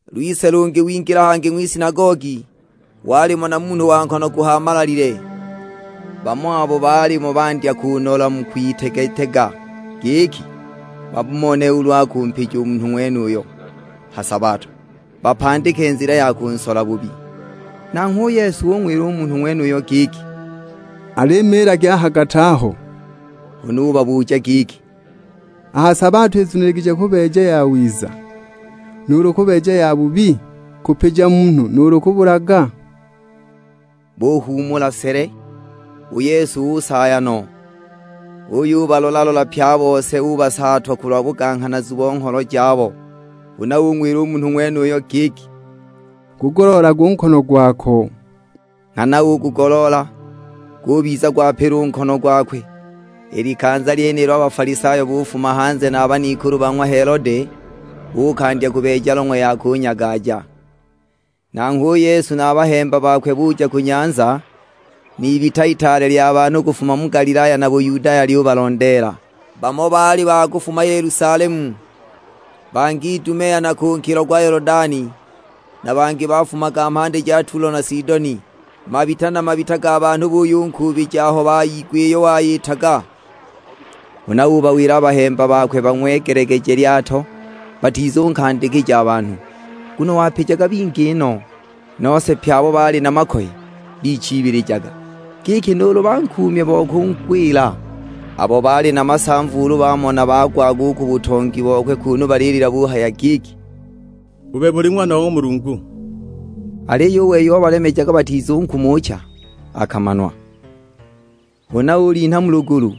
Lwise lungi wingila hangi ng'wisinagogi; walimo na munhu wa nkono guhaamalalile. Bamo abo baalimo bandya kunola mu kung'witega-tega, giki bamone ulu akumpija u munhu ng'wenuyo ha sabato, bapandike nzila ya kunsola bubi. Nanghwe u Yesu ung'wila u munhu ng'wenuyo giki, "Al'imiilaga a ha gati aho!" Huna ubabuja giki, "A ha sabato izuniligije kubeeja yawiza, nuulu kubeeja yabubi? Kupija munhu, nuulu kubulaga?" Buhuumula sele! U Yesu usaaya no, uyubalola-lola pye a bose, ubasaatwa kulwa buganghanazu bo ngholo jabo! Huna ung'wila u munhu ng'wenuyo giki, "Gugoloolage u nkono gwako." Nghana ugugoloola, gubiza gwapila u nkono gwakwe. I likanza lyenilo a Bafalisayo bufuma hanze na ban'ikulu ba ng'wa Helode, buukandya kubeeja long'we ya kunyagaja! Nanghwe u Yesu na a bahemba bakwe buja ku nyanza, n'ibita itaale lya banhu kufuma mu Galilaya na Buyudaya lyubalondeela. Bamo baali ba kufuma Yelusalemu, bangi Idumea na ku nkilo gwa Yolodani. Na bangi bafumaga mhandi ja Tulo na Sidoni: mabita na mabita ga banhu buyunkuubija aho bayigwa iyo wayitaga. Huna ubawila a bahemba bakwe bang'wegelegeje lyato, batizunkandikija a banhu; nguno wapijaga bingi no. Nose pye abo baali na makoye bichiibilijaga, giki nuulu bankuumye bo kungwila. Abo baali na masamva ulu bamona bagwaga u ku butongi bokwe kunu balilila buhaya giki, "U bebe uli Ng'wana wa ng'wa Mulungu." Aliyo u wei obalemejaga batizunkumucha akamanwa. Huna ulinha mu lugulu,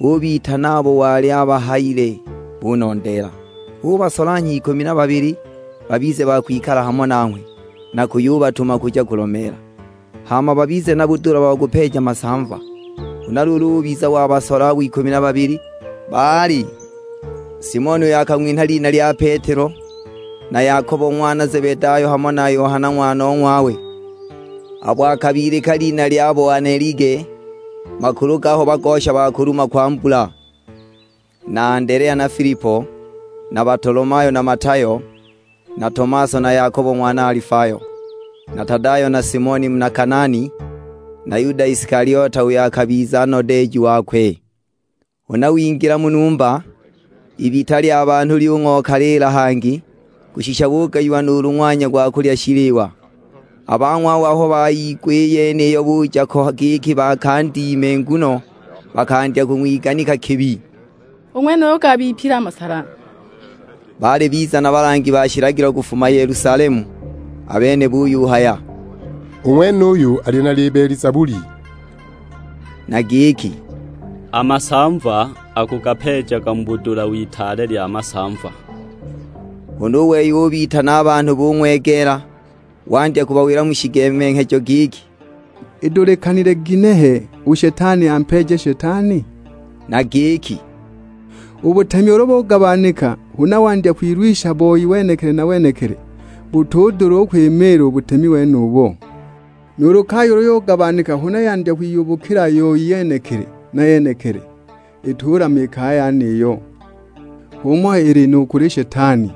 ubitana abo wali abahayile, bunondeela. Ubasolanhya ikumi na babili, babize ba kwikala hamo nanghwe, na kuyubatuma kuja kulomeela. Hama babize na budula bo kupeeja masamva. Huna luulu ubiza wabasola abo ikumi na babili; baali: Simoni uyo akang'winha lina lya Petelo, na Yakobo ng'wana Zebedayo hamo na Yohana ng'wanong'wawe, abo akabilika lina lya Boanelige, makulu gaho bagosha ba kuluma kwa mbula! Na Andelea na Filipo, na Batolomayo, na Matayo, na Tomaso na Yakobo ng'wana Alifayo, na Tadayo, na Simoni muna Kanaani, na Yuda Isikaliote, uyo akabiza nodeeji wakwe! Huna wingila mu numba, ibita lya banhu lyung'okaliila hangi, kushisha bugayiwa nuulu ng'wanya gwa kulya shiliwa. A bang'wawe aho bayigwa i yeniyo buja ko giki bakandime. Nguno bakandya kwiganika giki, "U ng'wenuyu gabipile a masala." Baali biza na balangi ba shilagilo kufuma Yelusalemu, a bene buyuhaya, "U ng'wenuyu ali na Libelizebuli," na giki, "A masamva akugapeejaga mu budula w'itaale lya masamva!" Huna u wei ubitana a banhu bung'wegeela, wandya kubawila mu shigemenghejo giki, "Idulikanile ginehe u Shetani ampeeje Shetani?" Na giki, "U butemi ulu bugabanika huna wandya kwilwisha boi wenekili na wenekili, butudula u kwimiila u butemi wenubo. Nuulu kaya ulu yugabanika huna yandya kwiyubukila yoi yenekili na yenekili, itulama i kaya yeniyo. H'umo ili nu kuli Shetani;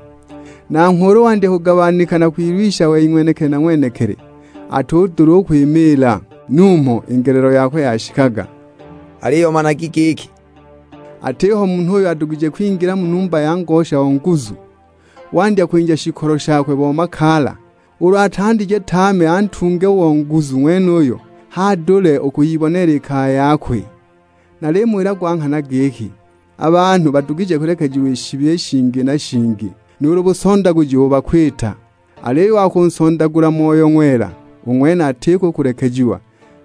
nanghwe ulu wandya kugabanika na kwilwisha wei ng'wenekili na ng'wenekili, atudula u kwimiila. Numho i ngelelo yakwe yashikaga." Aliyo managi giki, "Atiho munhu uyo adugije kwingila mu numba ya ngosha o nguzu, wandya kwinja shikolo shakwe bo makaala; ulu atandije tame antunge u o nguzu ng'wenuyo, h'adule u kwiyiboneela i kaya yakwe. Nalimuwila gwa nghana giki, a banhu badugije kulekejiwa i shibi i shingi na shingi, nuulu busondaguji ubo bakuwita. Aliyo u wa kunsondagula Moyo Ng'wela, u ng'wene atiko u kulekejiwa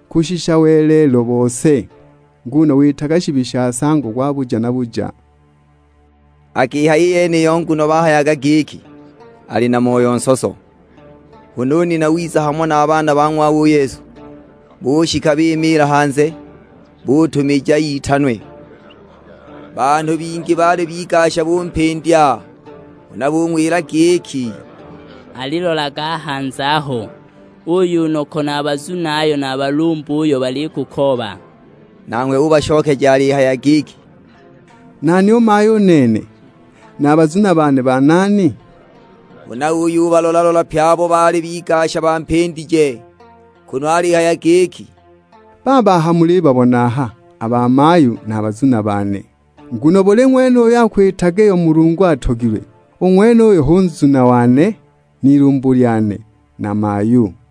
kushisha welelo bose, nguno witaga shibi sha nsango gwa buja na buja!" Akihaya i yeniyo nguno bahayaga giki, "Ali na moyo nsoso." Huna u nina wiza hamo na a baana ba ng'wawe u Yesu, bushika bimiila hanze, butumija itanwe. Banhu bingi baali bigasha bumpindya, huna bung'wila giki, "Alilolaga a hanze aho, uuyo u noko na a bazunayo na a balumbuyo balikukooba." Nanghwe ubashokeja alihaya giki, "Nani u mayu u nene, na a bazuna bane banani?" Huna uyubalola-lola pye abo baali bigasha bampindije, kunu alihaya giki, "Baaba mulibabona aha a bamayu na a bazuna bane. Nguno buli ng'wene uyo akwitaga iyo Mulungu atogilwe, u ng'wenuyo hu nzuna wane, n'ilumbu lyane, na mayu."